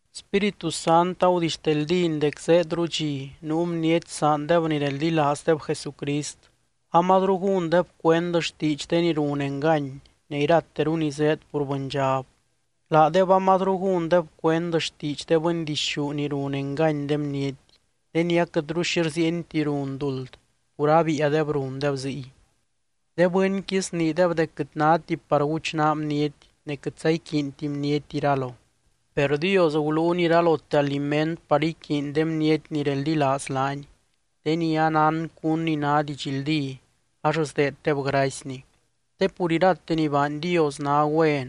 Spíritu Sant agudixteldíny dec zéedru dxi nuu bniety saandeb ni reldilaazdeb Jesucrist, amazru gúndeb cuend xtiidx de ni run engany ne irateru ni zéed pur bɨndxab. Laadeb amazru gúndeb cuend xtiidx de bɨndixú ni run engany de bniety, de ni aquɨtru xi rziienti run duld pur abiiadeb rundeb ziy. De bɨnqui sniideb dec quɨt náti par guchnaa bniety ne quɨtza iquiinti bniety iralo. Per Dios guluuny iralote aliment par iquiiny de bniety ni reldilaaz laany, de ni anán cún ni ná didxldí ax sdeeddeb gracyny. Te pur irate ni baany Dios ná güen,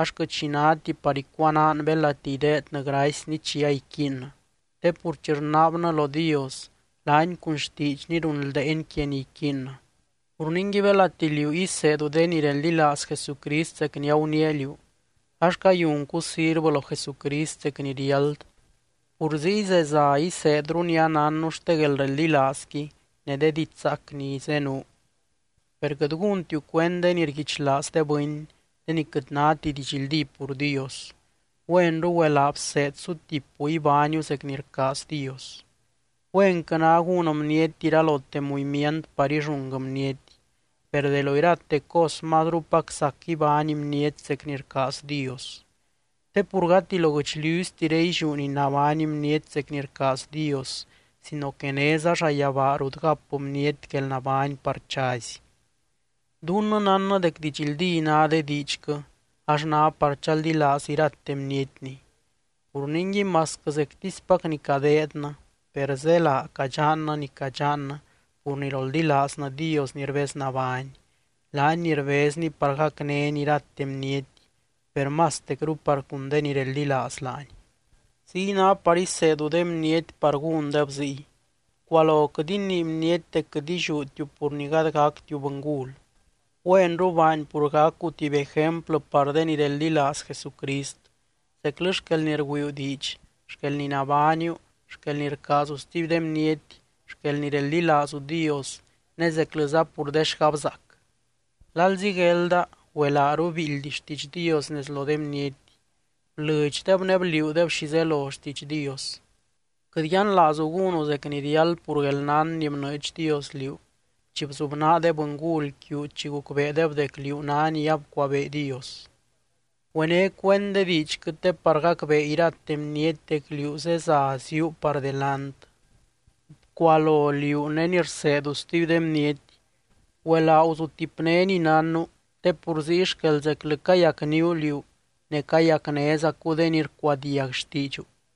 ax quɨt xi náti par icuanaan belati ideednɨ gracyny chi aiquiinnɨ. Te pur chi rnaabnɨ lo Dios laany cun xtiidxny runldeeny quia ni iquiinnɨ. Pur ningui, belati liú iseedu de ni reldilaaz Jesucrist zec ni aguniia liú, ax cayuncu sirvɨ lo Jesucrist zec ni riáld, pur ziy zeza iseedru ni anánnu xte guelreldilaazqui ne de didxzaac ni zenuu. Per quɨt gúntiu cuend de ni rguichlaaz de bɨny, de ni quɨt náti didxldí pur Dios, güenru güelaa bseed sutipu ibániu zec ni rcaaz Dios. Güenquɨ ná gún bniety iralote muimiant par illúng bniety, per de lo irate cos mazrupac sac ibány bniety zec ni rcaaz Dios. Te pur gati lo guɨchliuztiré illiú ni ibány bniety zec ni rcaaz Dios, sino que néza llayabaa rut gap bniety guelnabány par chazy. Dunnɨ nánnɨ dec didxldí ná de diidxquɨ, ax ná par chaldilaaz irate bnietni. Pur ningui masquɨ zectispac ni cadeednɨ, per zélaa cadxannɨ ni cadxannɨ pur ni roldilaaznɨ Dios ni rbeznabány, laany ni rbezny par gacnény irate bniety, per mastecru par cun de ni reldilaaz laany. Ziy ná par iseedu de bniety par gúndeb ziy. Bcualo quɨt inii bniety dec quɨt illiútiu pur ni gady gactiu bɨngul. Güenru baany pur gacu tuby ejemplɨ par de ni reldilaaz Jesucrist zeclɨ xquel ni rgüiiu diidx, xquel ni nabániu, xquel ni rcaazu stuby de bniety, xquel ni reldilaazu Dios ne zeclɨza pur de xgabzaac. Lalzi guelda, güelaaru biildy xtiidx Dios nez lo de bniety, blɨdxdeb ne bliuudeb xi zelo xtiidx Dios. Quɨt yianlaazu gúnu zec ni riáld pur guelnán ni bnɨɨdx Dios liú chi bzubnaa de bɨngul quiu chi gucbeedeb dec liú ná ni abcuabee Dios. Güené cuend de diidxquɨ te par gacbee irate bniety dec liú zeza ziúu par delant. Bcualo liú ne ni rseedu stuby de bniety. Güelaa guzutipné ni nánnu, te pur ziy xquel zeclɨ cayacníu liú ne cayacnézacu de ni rcuadiag xtiidxu.